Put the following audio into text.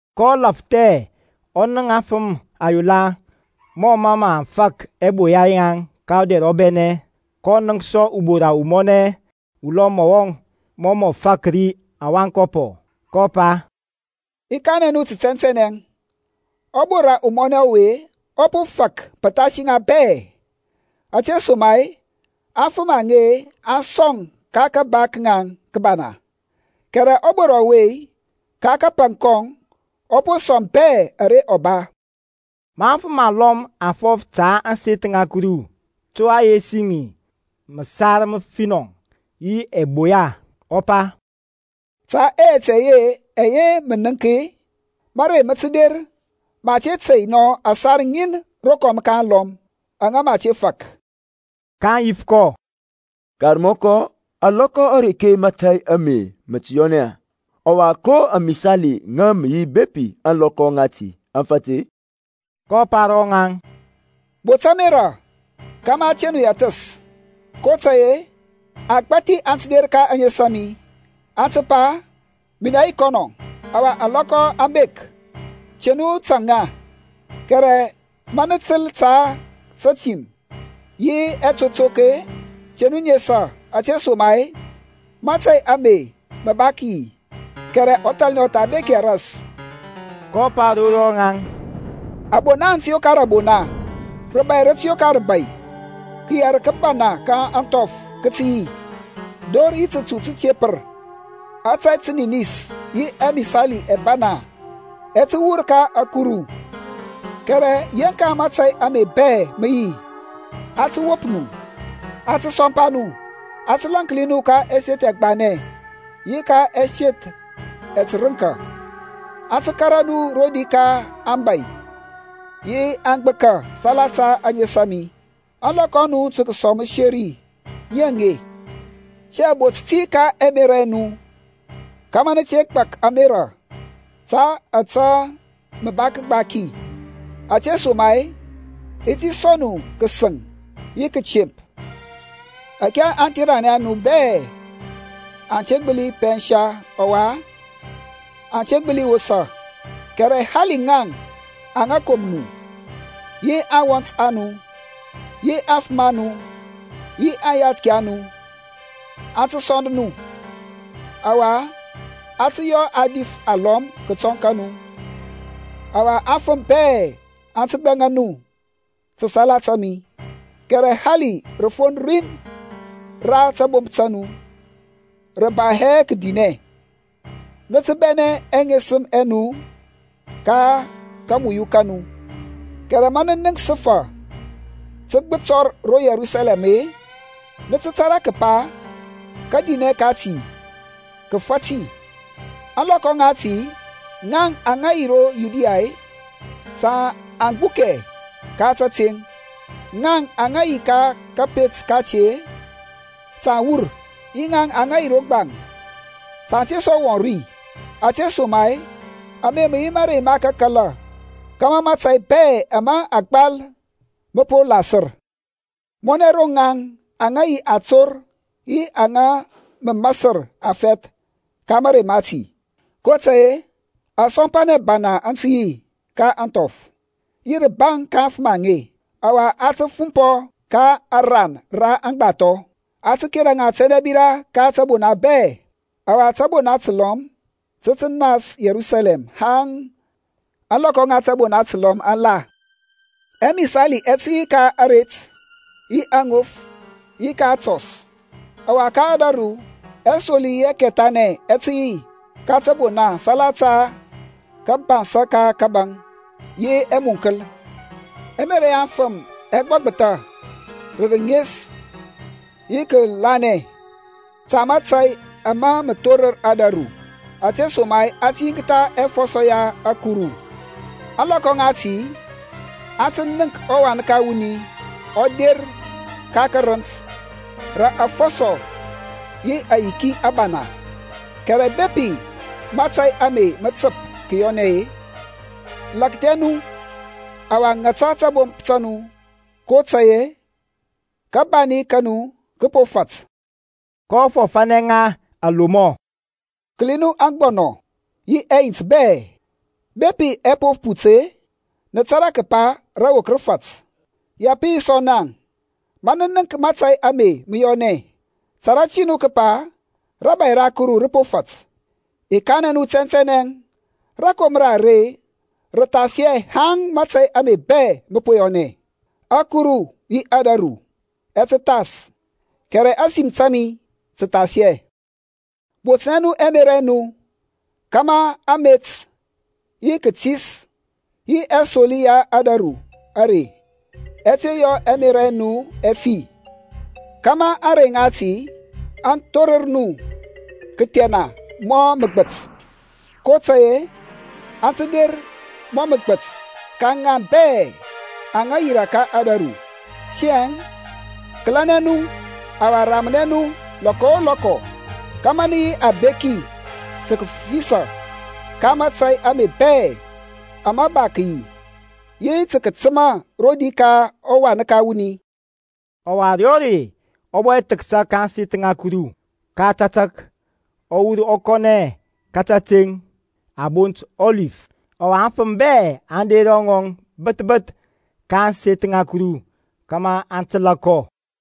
kɔ lafthɛ ɔ nənk aŋfəm ayola mɔ mə aŋ fak ɛboya yaŋ ka ɔdɛr ɔbɛnɛ. kɔ nənk sɔ ubora umɔnɛ ulɔm mɔ mɔ fak ri awankɔpɔ, kɔ pa, I kanɛ nu tə tɛntɛnɛ, ɔbora umɔnɛ ɔwe ɔ po fak pəthasi ŋa bɛ; ȧtesoma-e aŋfəm aŋe aŋ sɔŋ ka kaba ka ŋaŋ kəbana, kɛrɛ ɔbora ɔwe-e, ka kapaŋ kɔŋ ɔ po sɔŋ bɛ ara ɔ ba. Ma aŋfəm alɔm aŋ fɔf ta ȧŋseth ŋa Kuru, to a yesi ŋi məsar məfinɔ yi ɛboya, ɔ pa, Ta ɛyɛt ɛyɛ ɛyɛ nə nəŋk-e, mȧrey mə tə der ma a te tey nɔ ȧsar ŋin rokɔm ka alɔm, aŋa mə a te fak. kaŋ yif kɔ, Karmɔkɔ, alɔkɔ areke mȧtȧy ame mə tə yɔnɛ-e? Ɔwa ko amisali ŋə mə yi bepi ȧŋlɔkɔ ŋati aŋ fat-e? kɔ pa ro ŋaŋ, Bot ȧmerȧ kȧmȧ a te nu yɛthəs, kotȧy-e agbȧthi aŋ tə der ka ȧŋes a mi, aŋ tə pa, Minɛ yi kɔnɔ, ɔwa ȧŋlɔkɔ aŋ bek; te nu tȧŋ ŋa. Kɛrɛ ma nə təl ta tətim yi ɛtotok-e, te nu nesa, ȧtesoma-e mȧtȧy ame mə ba tə kəyi; kɛrɛ ɔthalnɛ ɔ tha bek hɛ ras. kɔ pa ro rɔŋaŋ, Abona aŋ tə yokar abona, rəbȧy rə tə yokar rəbȧy. Kəyɛr kəbana ka ȧŋthɔf kə tə yi, dor yi tətu tətepər; ȧtȧy təninis yi ɛmisali ɛbana ɛ tə wur ka ȧkuru. Kɛrɛ yeŋka mȧtȧy ame bɛ mə yi, aŋ tə wop nu, aŋ tə sɔmpa nu, aŋ tə lȧnki nu ka ɛseth ɛgbanɛ yi ka ɛseth ɛtərənka, aŋ tə kȧrȧ nu rodi ka aŋbȧy yi aŋgbəka salata ȧŋes a mi. Ȧŋlɔkɔ a nu tə kəsɔŋ məseri ŋi aŋe. Tiyȧŋ bot ti ka ɛmerȧ ɛ nu kȧmȧ nə te gbak ȧmerȧ ta ȧtȧ mə nə gbaki, ȧtesoma-e i ti sɔŋ nu kəsəŋ yi kətemp ȧke aŋtheranɛ a nu bɛ aŋ te gbəli pɛnsa ɔwa aŋ te gbəli wosa. Kɛrɛ hali ŋaŋ aŋa kom nu, yi aŋwɔnt a nu, yi aŋfəm a nu, yi aŋyathki a nu, aŋ tə sɔnd nu; ɔwa a tə yɔ a dif alɔm kətɔŋ ka nu. Ɔwa afəm bɛ aŋ tə gbɛŋa nu ta salata mi. Kɛrɛ hali rəfon rin ra tabomp ta nu rə ba hɛ kədinɛ. Nə tə bɛnɛ ɛŋesəm ɛ nu ka kamuyu ka nu. Kɛrɛ ma nə nənk səfa tə gbətɔr ro Yerusalɛm-e, nə tə tȧrȧ kəpa kadinɛ kati kə fat. Ȧŋlɔkɔ ŋati ŋaŋ aŋa yi ro Yudiya-e, ta aŋ gbukɛ ka tȧteŋ; ŋaŋ aŋa yi ka kȧpet kati-e, ta aŋ wur, yi ŋaŋ aŋa yi ro gbaŋ ta aŋ te sɔ wɔŋ ri, ȧtesoma-e ame mə yi mȧrey ma kakala, kȧmȧ mȧtȧy bɛ ama a gbal mə po lasər. Mɔnɛ ro ŋaŋ aŋa yi ator yi ŋaŋ aŋa mə masər afɛth ka mȧrey mati! kotȧy-e asɔmpanɛ abana aŋ tə yi ka ȧŋthɔf, yi rəbaŋ ka aŋfəm aŋe. Ɔwa a tə fumpɔ ka ȧran ra aŋgbathɔ, a tə kera ŋa tɛndɛbira ka tȧbona bɛ, ɔwa tȧbona təlɔm tə tə nas Yerusalɛm haŋ ȧŋlɔkɔ ŋa tȧbona təlɔm aŋ la. Ɛmisali ɛ tə yi ka aret, yi aŋof, yi ka atɔs; ɔwa ka ȧdȧru ɛsoli yi ɛkɛthanɛ ɛ tə yi ka təbona salata kȧbansȧ ka kȧbȧŋ yi ɛmunkəl. Ɛmerȧ ya aŋfəm ɛ gbɔgbəthȧ rə rənes yi kəkəlȧnɛ ta mȧtȧy ama mə thorər ȧdȧru, ȧtesoma-e a tə yiŋktha ɛfɔsɔ ya ȧkuru. Ȧŋlɔkɔ ŋati aŋ tə nənk ɔWan ka wuni ɔ der ka karənt rə afɔsɔ yi ayiki abana. Kɛrɛ bepi mȧtȧy ame mə təp kəyɔnɛ-e, lakthɛ nu, ɔwa ŋata tabomp ta nu, kotȧy-e kabani ka nu kə po fat. kɔ fɔfȧnɛ ŋa alomɔ, Kəli nu aŋgbɔnɔ, yi ɛyint bɛ; bepi ɛ po put-e, nə tȧrȧ kəpa rəwok rəfɛth rə po fat. Ya pə yi sɔ naŋ, ma nə nənk mȧtȧy ame mə yɔnɛ, tȧrȧ ti nu kəpa rȧbȧy ra Kuru rə po fat. I kanɛ nu tɛntɛnɛ, Rakomra are rə thas hɛ haŋ mȧtȧy ame bɛ mə po yɔnɛ. Ȧkuru yi ȧdȧru ɛ tə thas kɛrɛ ȧsim ta mi tə thas hɛ. Botnɛ nu ɛmerȧ ɛ nu kȧmȧ amet, yi kətis, yi ɛsoli ya ȧdȧru are ɛ te yɔ ɛmerȧ ɛ nu ɛ fi, kȧmȧ ȧŋrey ŋati aŋ thorər nu kəthɛna mɔ məgbət. kotȧy-e, aŋ tə der mɔ məgbət ka ŋaŋ bɛ aŋa yirȧ ka ȧdȧru. Tiyȧŋ kəlɛnɛ nu, ɔwa ramnɛ nu lɔkɔ o lɔkɔ kȧmȧ nə yi abeki tə kəfisȧ ka mȧtȧy ame bɛ ama ba kəyi, yi tə kətəma rodi ka ɔWan ka wuni. Ɔwa ȧrey o rei ɔ bɔ thəksa ka ȧŋseth ŋa Kuru, ka tȧtȧk ɔ wur ɔ kɔnɛ ka kateŋ a bont Ɔlif. Ɔwa aŋfəm bɛ aŋ der ro ŋɔŋ bəth bəth ka ȧŋseth ŋa Kuru kȧmȧ aŋ təlȧ kɔ.